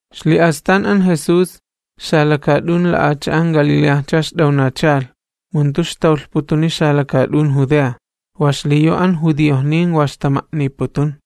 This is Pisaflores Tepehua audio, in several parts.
Ixli'astan an Jesús, xalakaat'un Galileajcha ixt'awnachalh, mu jantu ixtawlhputuni xalakaat'un Judea, wa xliyu an judiojnin wa ixtama'niputun.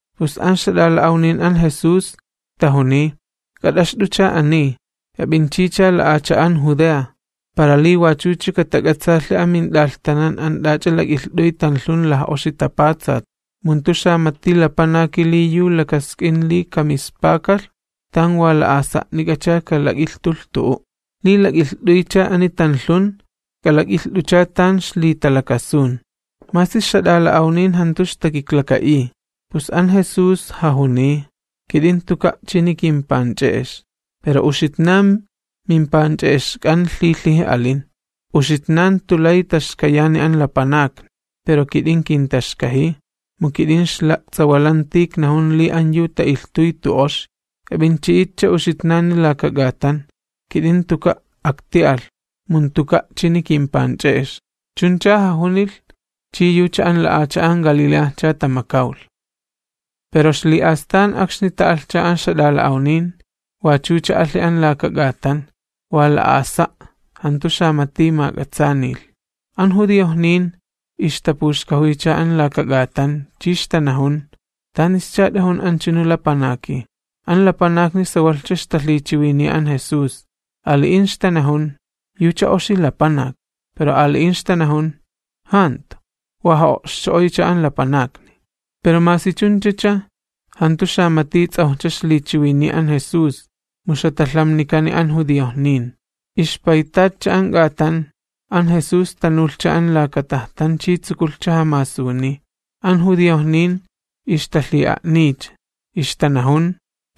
pus an ixjat'ala'awnin an Jesús tajuniy: ―K'at'axt'ucha ani, k'ap'inchicha xalakaat'un Judea, para li wachucha katala'tsilhi amint'alhtanan an t'ach'a lak'ilht'uy tanlhun laj'oxi tapatsat. Mu jantu xamati lapanaki li yu lakask'in li kamispakalh, tan wa la'asa'nik'acha kalak'ilhtulh tu'u'. Li lak'ilht'uycha ani tanlhun, k'alak'ilht'ucha tan ixlitalakasun. Masi ixjat'ala'awnin jantu ixtakiklaka'iy. Pus an Jesús jajuniy: ―Kit'in jantuka' chini kimpanch'e'ex, pero uxitnan mimpanch'e'exk'an lhilhiji alin. Uxitnan jantu lay taxkayani an lapanakni, pero kit'in kintaxkajiy, mu kit'in ixla'ts'awalanti iknajun li an yu ta'ilhtuy jantu oxi. K'ap'inchi'itcha uxitnani laka k'atan, kit'in jantuka' akti'alh, mu jantuka' chini kimpanch'e'ex. Chuncha jajunilh, chi yucha an xalakaat'un Galileajcha tamakawlh. Pero ixli'astan akxni ta'alhcha an ixjat'ala'awnin, wachucha alhi an laka k'atan, wa la'asa', jantu xamati mak'atsaanilh. An judiojnin ixtapuxkajuycha an laka k'atan, chi ixtanajun: ―¿Tanischa t'ajun anchunu lapanaki? An lapanakni sawalhcha ixtalhichiwiniya an Jesús. Ali'in ixtanajun: “Yucha oxi lapanak.” Pero ali'in ixtanajun: “Jantu, wa ja'o'xcho'oycha an lapanakni.” Pero masi chunchacha, jantu xamati ts'awj ixlichiwiniy an Jesús, mu ixjatalhamnikani an judiojnin. Ixpaytatcha an k'atan, an Jesús tanulhcha an laka tajtan chi tsukulhcha jamasuniy. An judiojnin ixtalhi'a'niycha, ixtanajun: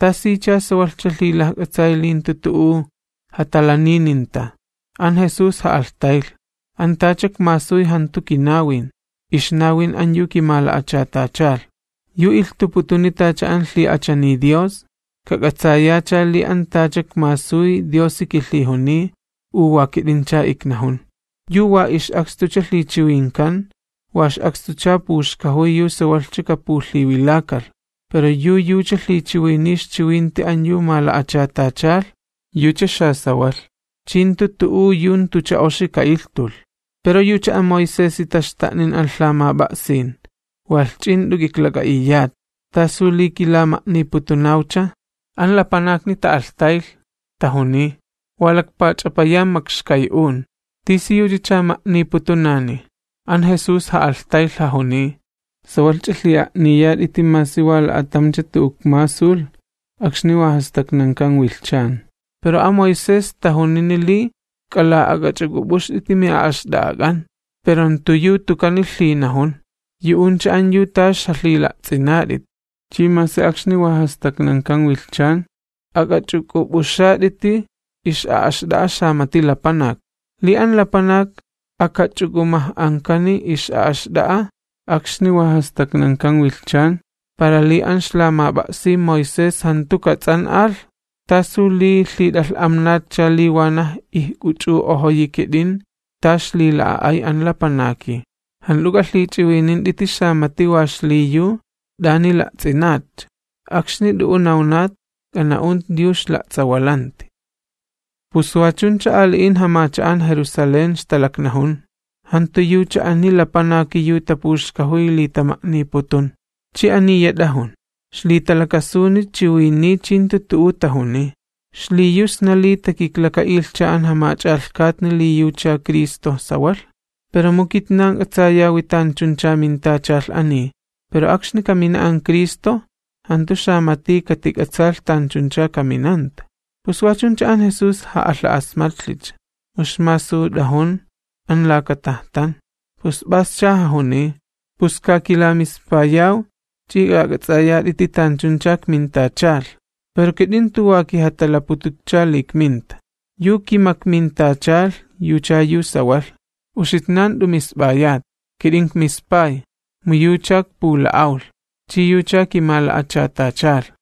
―¿Tasicha sawalhcha lhilajk'atsay li jantu tu'u jatalanininta? An Jesús ja'alhtaylh: ―An tacha ikmasuy jantu kinawin, ixnawin an yu kimala'achatachalh. Yu ilhtuputuni tacha an lhi'achaniy Dios, kak'atsayacha li an tacha ikmasuy Diosi kilhijuniy u wa kit'incha iknajun. Yu wa ix'akstucha lhichiwinkan, wa ix'akstucha puxkajuy yu sawalhcha kapulhiwilakalh. Pero yu yucha lhichiwiniy ixchiwinti an yu mala'achatachalh, yucha xasawalh, chi jantu tu'u yu jantucha oxi ka'ilhtulh. ’Pero yucha an Moisesi taxta'nin an lhamap'a'sin, walh ch'i jant'u k'iklak'a'iyat. ¿Tasu li kilama'niputunawcha? An lapanakni ta'alhtaylh, tajuniy: ―Wa lakpach'apayan makxkay'un, ¿tisiyuchacha ma'niputunani? An Jesús ja'alhtaylh, jajuniy: ―Sawalhch'a lhi'a'niyat'iti masi wa la'atamcha tu'u ikmasulh akxni jantu tapatsakan wilhchan. Pero an Moisés tajunini li k'ala'ak'axwililich'uk'up'uxt'iti mi'a'axt'a'ak'an, pero jantu yu tukani lhinajun, yu'uncha an yu t'a ixjalhila'ts'inat'it. Chi masi akxni jantu tapatsakan wilhchan, ak'axwililich'uk'up'uxat'iti xamati lapanak. Li an lapanak akaxwililich'uk'up'uxkani ix'a'axt'a'a akxni jantu tapatsakan wilhchan para li an ixlamap'a'sin Moisés jantu kats'an'alh, ¿tasu li lhit'alh'amnatcha li wanaj ijk'uch'u'ojoyi kit'in ta ixlila'a'ay an lapanaki? Jant'u k'alhich'iwinint'iti xamati wa xliyu t'ani la'ts'inatcha, akxni t'u'u nawnat, k'ana'unt'it yu ixla'ts'awalanti. Pus wa chuncha ali'in jamacha'an Jerusalén ixtalaknajun: ―¿Jantu yucha ani lapanaki yu tapuxkajuy li tama'niputun? Chi aniya t'ajun, ixlitalakasuni chiwiniy chi jantu tu'u tajuniy. ¿Xliyu sna li takiklaka'ilhcha an jamach'alhkatni li yucha Cristo sawalh? Pero mu kitnan k'atsayawi tanchuncha mintachalh ani, pero akxni kamina an Cristo, jantu xamati katik'atsaalh tanchuncha kaminanta. Pus wa chuncha an Jesús ja'alha'asmatlhicha, mu ixmasut'ajun an laka tajtan, pus p'ascha jajuniy: ―¡Pus kakilamispayaw ch'i k'ak'ats'ayat'it'i tanchuncha ikmintachalh! Pero kit'in jantu wa kijatalapututcha li ikminta, yu kimakmintachalh yucha yu sawalh, uxitnan jant'u misp'ayat. Kit'in ikmispay, mu yucha ikpula'awlh, chi yucha kimala'achatachalh.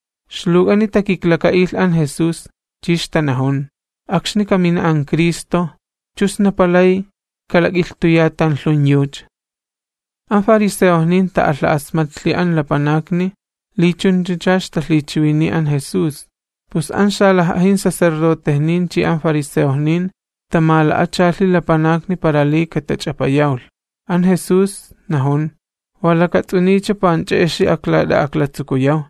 Ixluwk'ani takiklaka'ilh an Jesús chi ixtanajun: ―Akxni kamina an Cristo, ¿chu sna palay kalak'ilhtuya tanlhun yucha? An fariseojnin ta'alha'asmatlhi an lapanakni li chunchacha ixtalhichiwiniy an Jesús. Pus an xalaj'ajin sacerdotejnin chi an fariseojnin tamala'achalhi lapanakni para li katach'apayawlh. An Jesús najun: ―Wa lakats'uniycha panch'e'exi aklat'a'aklatsukuyaw,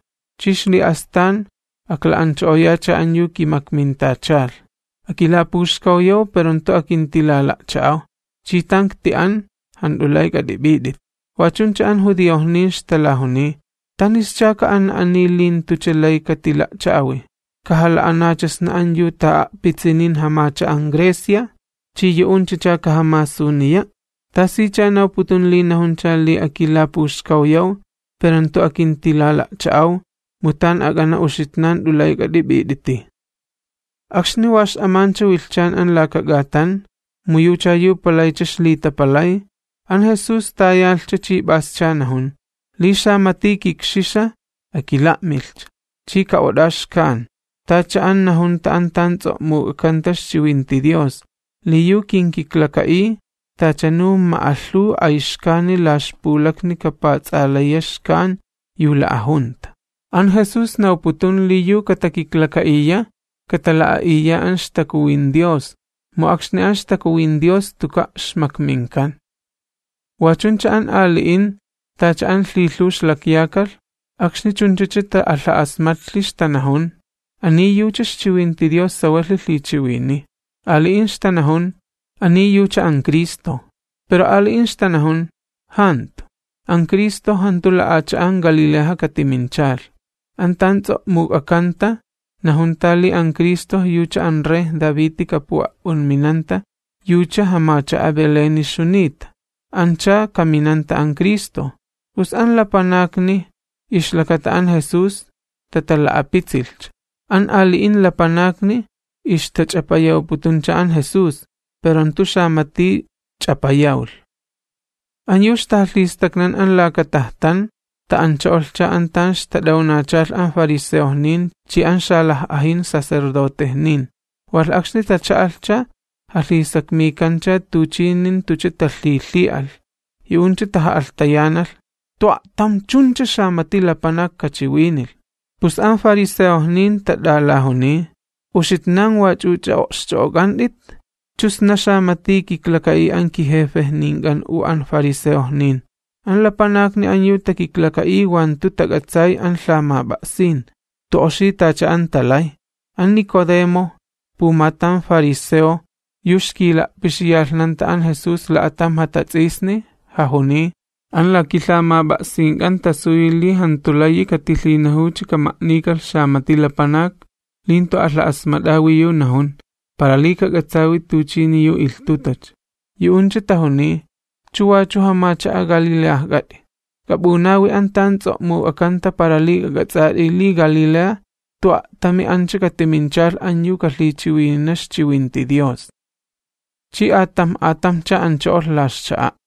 chi ixli'astan akla'ancho'oyacha an yu kimakmintachalh. Akilapuxkawyaw, pero jantu akintilala'cha'aw chi tan ikti'an jant'u lay k'at'ip'it'it. Wa chuncha an judiojnin ixtalajuniy: ―¿Tanischa ka'ana ani li jantucha lay katila'cha'awi? ¿Kajala'anacha sna an yu ta'a'pitsinin jamacha'an Grecia chi yu'unchacha kajamasuniya'? ¿Tasicha nawputun li najuncha li: “Akilapuxkawyaw, pero jantu akintilala'cha'aw, mu tan ak'ana uxitnan jant'u lay k'at'ip'it'iti'”? Akxni wa x'amancha wilhchan an laka k'atan, mu yucha yu palaycha ixlitapalay, an Jesús tayalhcha chi p'ascha najun: ―Li xamati kikxixa, akila'milhcha, chi ka'ot'a' xkan. Tacha an najunta an tan ts'o'muk'akanta ixchiwinti Dios, li yu kinkiklaka'iy, tachanu ma'alhuw ayxkani la ixpulakni kapujats'alaya xkan yu la'ajunta. An Jesús nawputun li yu katakiklaka'iya, katala'a'iya an ixTakuwin Dios, mu akxni an ixTakuwin Dios jantuka' ixmakminkan. Wa chuncha an ali'in tacha an lhilhuw ixlakyakalh, akxni chunchacha ta'alha'asmatlhi, ixtanajun: ―Ani yucha ixchiwinti Dios sawalhi lhichiwiniy. Ali'in ixtanajun: ―Ani yucha an Cristo. Pero ali'in ixtanajun: ―Jantu, an Cristo jantu xalakaat'un Galileaja katiminchalh. An tan ts'o'muk'akanta najunta li an Cristo yucha an rey Daviti kapu'a'p'unminanta, yucha jamacha'a Beléni ixjunita, ancha kaminanta an Cristo. Pus an lapanakni ixlakata an Jesús tatala'apitsilhcha. An ali'in lapanakni ixtach'apayawputuncha an Jesús, pero jantu xamati ch'apayawlh. An yu ixtajalhistaknan an laka tajtan ta'ancho'olhcha an tan ixtat'awnachalh an fariseojnin chi an xalaj'ajin sacerdotejnin, walh akxni tacha'alhcha jalhisakmikancha tuchini jantucha talhilhi'alh. Yu'uncha taja'alhtayanalh: ―¡Jantu a'tam chuncha xamati lapanak kachiwinilh! Pus an fariseojnin tat'alajuniy: ―¿Uxitnan wach'uch'a o'xch'o'ok'ant'it? ¿Chu sna xamati kiklaka'iy an kijefejnink'an u an fariseojnin? An lapanakni an yu takiklaka'iy wa jantu tak'atsay an lhamap'a'sin, jantu oxi tacha an talay. An Nicodemo, pumatam fariseo yu ixkila'pixiyalhnanta an Jesús la'atam jatats'isni, jajuniy: ―An la kilhamap'a'sink'an tasuyi li jantu layi katima'niw xamati lapanak li jantu alha'asmat'awi yu najun, para li kak'atsawi tuchini yu ilhtutacha. Yu'uncha tajuniy: ―¿Chu wachu jamacha'a Galileajk'at'i? K'ap'unawi an tan ts'o'muk'akanta para li k'ak'ats'at'i li Galilea jantu a'tami ancha katiminchalh yu kalhichiwinina ixchiwinti Dios. [ Chi atamj atamjcha ancho'olh la ixcha'a'.